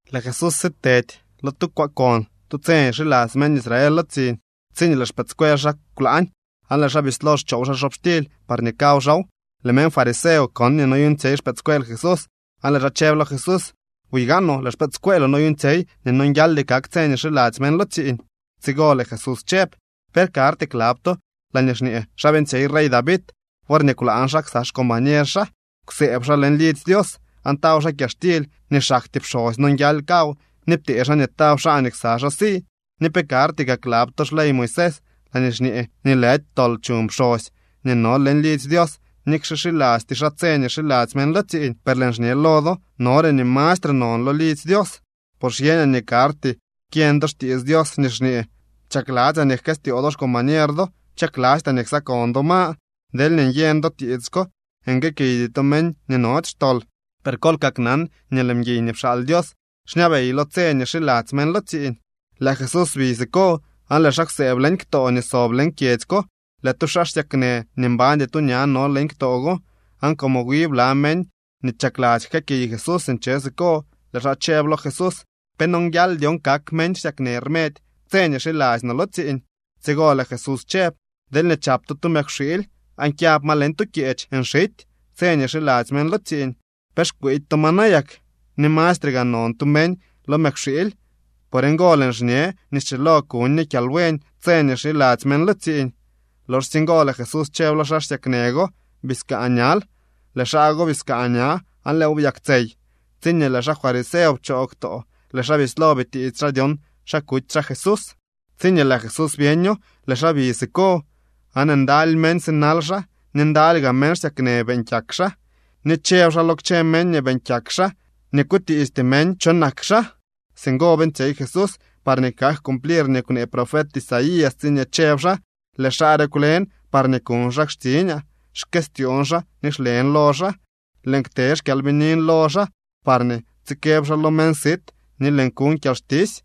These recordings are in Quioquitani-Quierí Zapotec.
Lëë Jesús sitedy lo tu kwaakon tu tse nii xiladzy meñ Israel lo tsiiñ, tsiñee lëë xpëëdscuel xaa kwlaañ aan lëë xaa bislo xchoow xaa xobxtily parñee kaw xaaw. Lëë meñ fariseo kon nii noyuuñtsyey xpëëdscuel Jesús, aan lëë xaa chëb lo Jesús: —Buy gaanoo, lëë xpëëdscueeloo noyuuñtsyey nii nonguialdy kak tse nii xiladzy meñ lo tsiiñ. Tsigo lëë Jesús chëb: —¿Pe karty klab to laañee xñee xa beeñtsyey rey David worñee kwlaañ xaa ksa xcombañer xaa? Kwsëëb xaa leñ lidzy Dios aan taw xaa kyaxtily nii xaktyee pxosy nonguial kaw ni ptee xaa nii taw xaa nii ksa xaa si. ¿Ni pe karty kaa klab to xley Moisés laañee xñee nii lëdy tol chuñ pxosy nii no leñ lidzy Dios nikxe xilasty xaa tse nii xiladzy meñ lo tsiiñ? Per lëën xñe lo do nore nii mastre non lo lidzy Dios. Por xyeñaa nii karty kyeñ do xtiits Dios nii xñee: “Chakladzyaa nii jkëstyoo do xcombañer do, chaklastyaa nii ksakon do ma.” Deelñee nyeñ do tiits ko, nguëëkiydy to meñ nii nody xtol. Per kol kaknan nii lëë mguiy nii pxaal Dios xñabey lo tse nii xiladzy meñ lo tsiiñ. Lëë Jesús bi siko aan lëë xaa kwsëëb leñ ktoo nii sob leñ kyedzy ko. Lëë tu xaa xsyaknë nii mbañdy tu ña no leñ ktoo go, aan como wi bla meñ nii chakladzy jkëëkiy Jesús nche siko, lëë xaa chëb lo Jesús: —¿Pe nonguial dyon kak meñ xsyaknë rmedy tse nii xiladzy no lo tsiiñ? Tsigo lëë Jesús chëb: —Deelñee chap to tu mëkwxiily aan xyab ma leñ tu kyeech nxity tse nii xiladzy meñ lo tsiiñ, ¿pe xkwiidy to ma nayak? ¡Ni mastre gaa non tu meñ lo mëkwxiily! Por ngo lëën xñe nii schilo kuñ ñe kyalbuen tse nii xiladzy meñ lo tsiiñ. Loxsye ngo lëë Jesús chëb lo xaa xsyaknë go: —Biskaa ñal. Lëë xaa go biskaa ña, aan lëëw byaktsey. Tsiñee lëë xaa fariseo pchoo ktoo, lëë xaa bislo bitiits xaa dyon xa kuty xaa Jesús. Tsiñee lëë Jesús byeño, lëë xaa bi siko. Aan ndaly meñ sinal xaa ni ndaly gaa meñ xsyaknë beeñ kyak xaa, ni chëb xaa lo kchë meñ nii beeñ kyak xaa nii kutiisty meñ cho nak xaa. Singo beeñtsyey Jesús parñee kak cumplir nii kwnee profet Isaías tsiñee chëb xaa: Lëë xaa re kwlen parñee kuñ xaa xtsiñaa. Xkëstyoon xaa ni xlen lo xaa. Lëën kte xkyalbinin lo xaa, parñee tsikëb xaa lo meñ sit nii lëën kuñ kyalxtisy.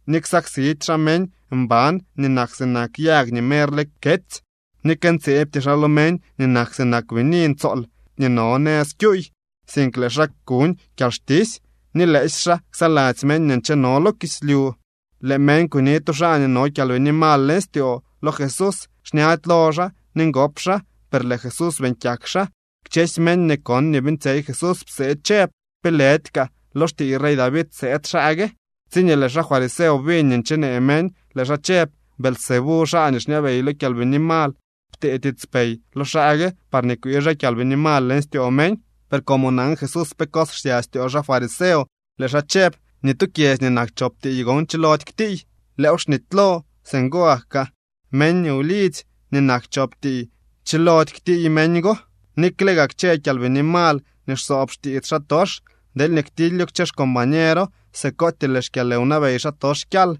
Ni ksaksidy xaa meñ mban nii nak sinak yag nii merle ketsy ni këntseebty xaa lo meñ nii nak sinak bini ntsool nii no nëz kyuuy, sink lëë xaa kuñ kyalxtisy. Ni lëësy xaa ksaladzy meñ nii ncheno lo kislyu. Lëë meñ kuni tu xaa nii no kyalbini mal leñ styoo lo Jesús. Xñady lo xaa ni ngop xaa, per lëë Jesús beeñ kyak xaa. Kchësy meñ nii kon nii beeñtsyey Jesús psee chëb: —¿Pe lëdy kaa lo xtiiy rey David sëëd xaa gue? Tsiñee lëë xaa fariseo biñ nii nchenee meñ, lëë xaa chëb: —Beelzebú, xaa nii xñabey lo kyalbini mal ptee tiitspey lo xaa gue parñee kwii xaa kyalbini mal leñ styoo meñ. Per como nan Jesús pe cos xsya styoo xaa fariseo, lëë xaa chëb: —Ni tu kyedzy nii nak chop tiiy gon chilody ktiiy. Lëëw xnitylo. Singo gak kaa meñ wlidzy nii nak chop tiiy chilody ktiiy meñ go. Nikle gaa kchë kyalbini mal nii xsoob xtiits xaatox, deelñee ktilyo kchë xcombañero, sikootyee lëë xkyalwnabey xaatox kyal.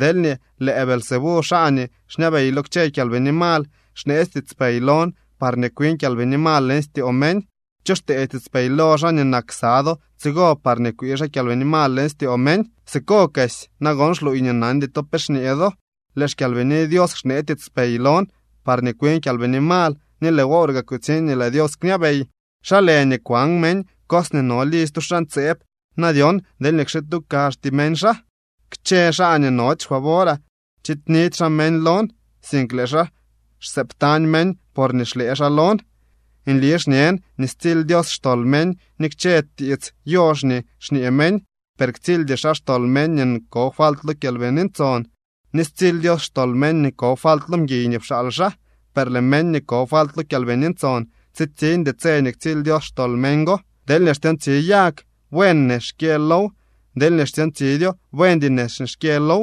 Deelñee lëë Beelzebú, xaa nii xñabey lo kchë kyalbini mal, xneetsy tiitspey lon parñee kwin kyalbini mal leñ styoo meñ, ¿cho xtee tiitspey lo xaa nii nak ksa do tsigo parñee kwii xaa kyalbini mal leñ styoo meñ? Sikokesy nagon xluuy nii nandy to pe xñee do. Lëë xKyalbini Dios xnee tiitspey lon parñee kwin kyalbini mal, ni lëë wor gaa kutsiñ nii lëë Dios kñabey. ’¿Xa lë nii kwan meñ cos nii no lidzy tu xaa ntseeb na dyon deelñee kxituu kazhty meñ xaa? ’Kchë xaa nii nody xfavoraa chiidnidy xaa meñ lon, sink lëë xaa xsëëbtañ meñ porñee xlëë xaa lon. ’Nli xñen nii stsily Dios xtol meñ ni kchë tiits yox nii kñee meñ, per ktsildy xaa xtol meñ nii ko falt lo Kyalbini Ntson. Ni stsily Dios xtol meñ nii ko falt lo mguiy nii pxaal xaa, per lëë meñ nii ko falt lo Kyalbini Ntson, tsitsiñdy tse nii ktsily Dios xtol meñ go. ’Deelñee xtyoontsi yag, buen nex nii xkyë low. Deelñee xtyoontsidyo, buendy nex nii xkyë low.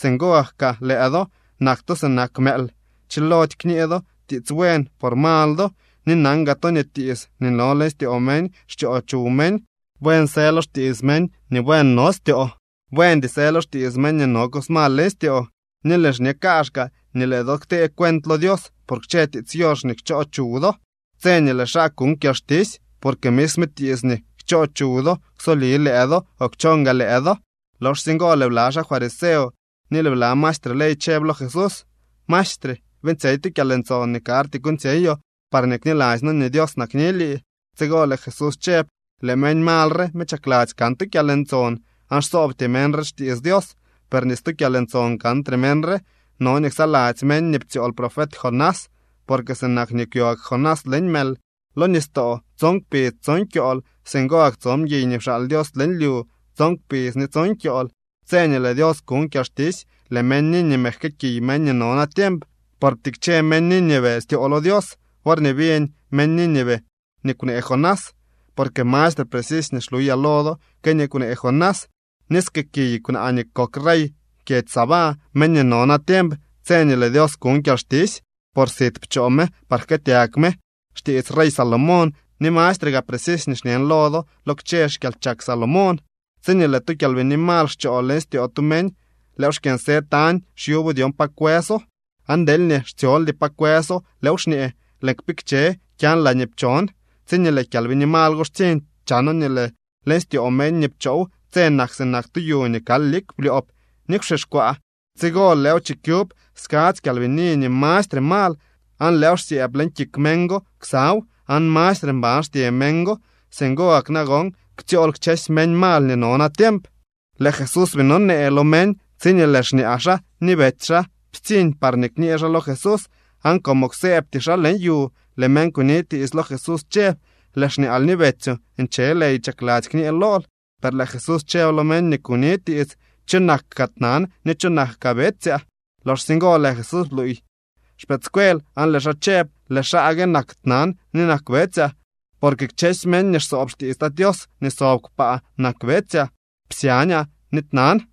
Singo gak kaa lëë do. ¡Nak to sinak mëël! Chilody kñee do tiits buen por mal do. Ni nan gaa to nii tiits nii no leñ styoo meñ xchoo chuw meñ. Buen së lo xtiits meñ nii buen no styoo. Buendy së lo xtiits meñ nii no cos mal leñ styoo. Ni lëën xñe kaazhkaa nii lëë do ktee cuent lo Dios por kchë tiits yox nii kchoo chuw do tse nii lëë xaa kuñ kyalxtisy. Porque misme tiits nii kchoo chuw do ksoli lëë do o kchon gaa lëë do. Loxsye ngo lëë bla xaa fariseo ni lëë bla maestre ley chëb lo Jesús: —Maestre, beeñtsyey tu kyalntson nii karty kuuñtsyeyoo parñee kniladzy noo nii Dios nakni lii. Tsigo lëë Jesús chëb: —Lëë meñ mal re me chakladzy kan tu kyalntson, aan xsoobty meñ re xtiits Dios, per ni stu kyalntson kantre meñ re. No nii ksaladzy meñ nii ptsyool profet Jonás. Porque sinak nii kwyo gak Jonás leñ mël lo nistoo tson kpidz tson kyool, singo gak tso mguiy nii pxaal Dios leñ lyu tson kpidz ni tson kyool. Tse nii lëë Dios kuñ kyalxtisy lëë meñ Nínive jkëëkiy meñ nii no natiemp, por ptikche meñ Nínive styoo lo Dios worñee biñ meñ Nínive nii kwnee Jonás, porque mastre precisy nii xluyaa lo do que nii kwnee Jonás. Ni skëëkiy kwnaa nii kok rey kyedzy Sabá meñ nii no natiemp tse nii lëë Dios kuñ kyalxtisy, por sit pchoo me par jkëëtyag me xtiits rey Salomón, ni mastre gaa precisy nii xñen lo do lo kchë xkyalchak Salomón. ’Tsiñee lëë tu kyalbini mal xchoo leñ styoo tu meñ, lëëw xkyënsë tañ xyubo dyon pa kwëso. Aan deelñee xtsyoldy pa kwëso, lëëw xñee: “Lëën kpikche kyan laañee pchon.” Tsiñee lëë kyalbini mal go xtsiñ, chano nii lëë leñ styoo meñ nii pchow tse nak sinak tu yu nii kal lik blyoob ni kwxixkwaa. Tsigo lëëw chikyub skadzy kyalbini nii mastre mal, aan lëëw xsyëëb leñ kik meñ go ksaw, aan mastre mban xtye meñ go. Singo gak nagon ktsyool kchësy meñ mal nii no natiemp. Lëë Jesús bii nonee lo meñ, tsiñee lëë xñaa xaa ni betsy xaa ptsiñ parñee kñee xaa lo Jesús. Aan como kwsëëbty xaa leñ yu, lëë meñ kuni tiits lo Jesús chëb: —Lëë xñaal ni betsyoo nche ley chakladzy kñee lool. Per lëë Jesús chëb lo meñ nii kuni tiits: —¿Cho nak kaa tnan ni cho nak betsyaa? Loxsye ngo lëë Jesús bluuy xpëëdscuel aan lëë xaa chëb: —Lëë xaa gue nak tnan ni nak betsyaa. Porque kchësy meñ nii xsoob xtiits Tat Tios nii sob kpaa nak betsyaa, psyañaa ni tnan.